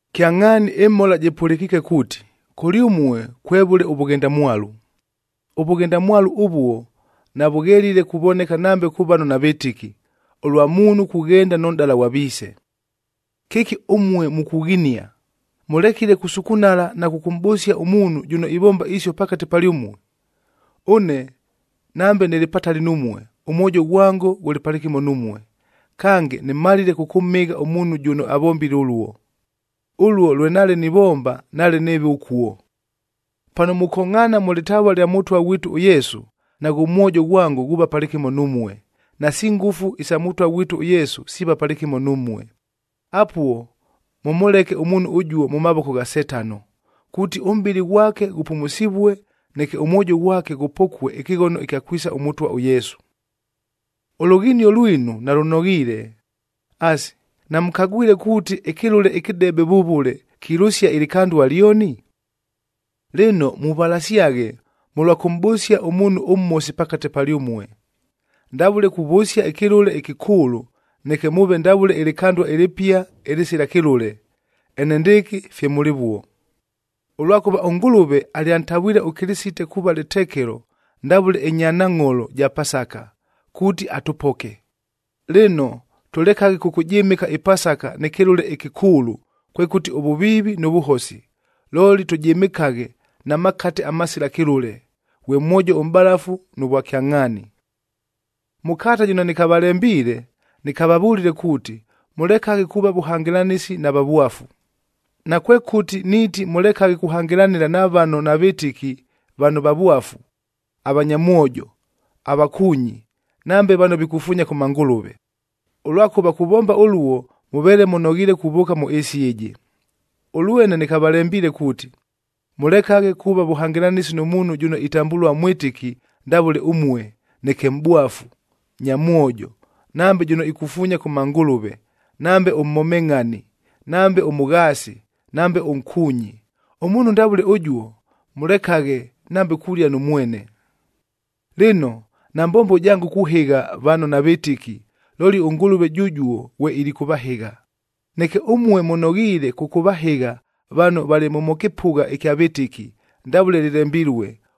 Kyangʼhaani ɨmhola jɨpʉlɨkiike kuuti, kʉlyʉmue kwevʉle ʉvʉghendamwalu. Ʉvʉghendamwalu ʉvuo navʉghelile kuvoneka nambe kʉ vano navɨtɨki, ʉlwa muunhu kughenda nʉ nʼdala ghwa viise. Kɨki ʉmue mukughinia! Mʉlekile kusukunala na kʉkʉmʼbʉsia ʉmuunhu jʉno ivomba isio pakate palyʉmue! Ʉne nambe nɨlɨ patali numue, ʉmwojo ghwango ghʉlɨ palɨkɨmo numue, kange nɨmalile kʉkʉmhɨgha ʉmuunhu jʉno avombile ʉluo. Ʉluo lwe nale nivomba, nale nɨɨve ʉkuo. Pano mukongʼhaana mʉ lɨtavua lya Mʉtwa ghwitu ʉYesu, naghʉ mwojo ghwango ghuuva palɨkɨmo numue, nasi ngʉfu isa Mʉtwa ghwitu ʉYesu siiva palɨkɨmo numue. Apuo mʉmʉleke ʉmuunhu ʉjuo mʉ mavoko gha Setano, kuuti ʉmʼbɨlɨ ghwake ghʉpumusivue, neke ʉmwojo ghwake ghʉpokue ɨkɨghono ɨkya kwisa ʉMʉtwa ʉYesu. Ʉlughinio lwinu nalʉnoghiile. Asi, namʉkagwile kuuti ɨkɨlʉle ɨkɨdebe vʉvʉle, kilʉsia ɨlɨkandua lyoni? Lɨno muvalasyaghe, mʉlwa kʉmʼbʉsia ʉmuunhu ʉmhosi pakate palyʉmue, ndavʉle kuvʉsia ɨkɨlʉle ɨkɨkʉʉlʉ, neke mʉʉve ndavʉle ɨlɨkandua ɨlɨpia ɨlɨsila kɨlʉle, enendɨɨkɨ fye mʉlɨvuo. Ʉlwakʉva ʉNgʉlʉve alyantavwile ʉKɨlɨsite kuuva lɨtekelo ndavʉle ɨnyanangʼholo ja Pasaka,a kuuti atʉpoke. Lɨno, tʉlekaghe kʉkʉjɨmɨka ɨPasaka nɨ kɨlʉle ɨkɨkʉʉlʉ, kwekʉti ʉvʉviivi nʉ vʉhosi, looli tʉjɨmɨkaghe na makate amasila kɨlʉle,b ghwe mwojo ʉmʼbalafu nʉ vwakyangʼhaani. Mʉ kalata jɨno nɨkavalembiile, nɨkavavʉlile kuuti, mʉlekaghe kuuva vʉhangɨlanɨsi na vavwafu. Nakwekʉti niiti mʉlekaghe kuhangɨlanɨla na vano navɨtɨki vano vavwafu, avanyamwojo, avakuunyi, nambe vano vikufuunya kʉ mangʉlʉve. Ʉlwakʉva kuvomba ʉluo mʉveele mʉnoghiile kuvʉʉka mʉ ɨɨsi ɨjɨ. Ʉlwene nɨkavalembiile kuuti, mʉlekaghe kuuva vʉhangɨlanɨsi nʉ muunhu jʉno itambʉlua mwɨtɨki ndavʉle ʉmue, neke mʼbwafu, nyamwojo, nambe jʉno ikufuunya kʉ mangʉlʉve, nambe ʉmhomengʼhani, nambe ʉmʉghaasi, nambe ʉnkuunyi. Ʉmuunhu ndavʉle ʉjuo, mʉlekaghe nambe kulia nʉ mwene. Lɨno, nambombo jango kuhɨgha vano navɨtɨki, looli ʉNgʉlʉve jʉjuo ghwe ilikʉvahɨgha. Neke ʉmue mʉnoghiile kʉkʉvahɨgha vano valɨ mʉ mʉ kɨpʉgha ɨkya vɨtɨki, ndavʉle lɨlembilue,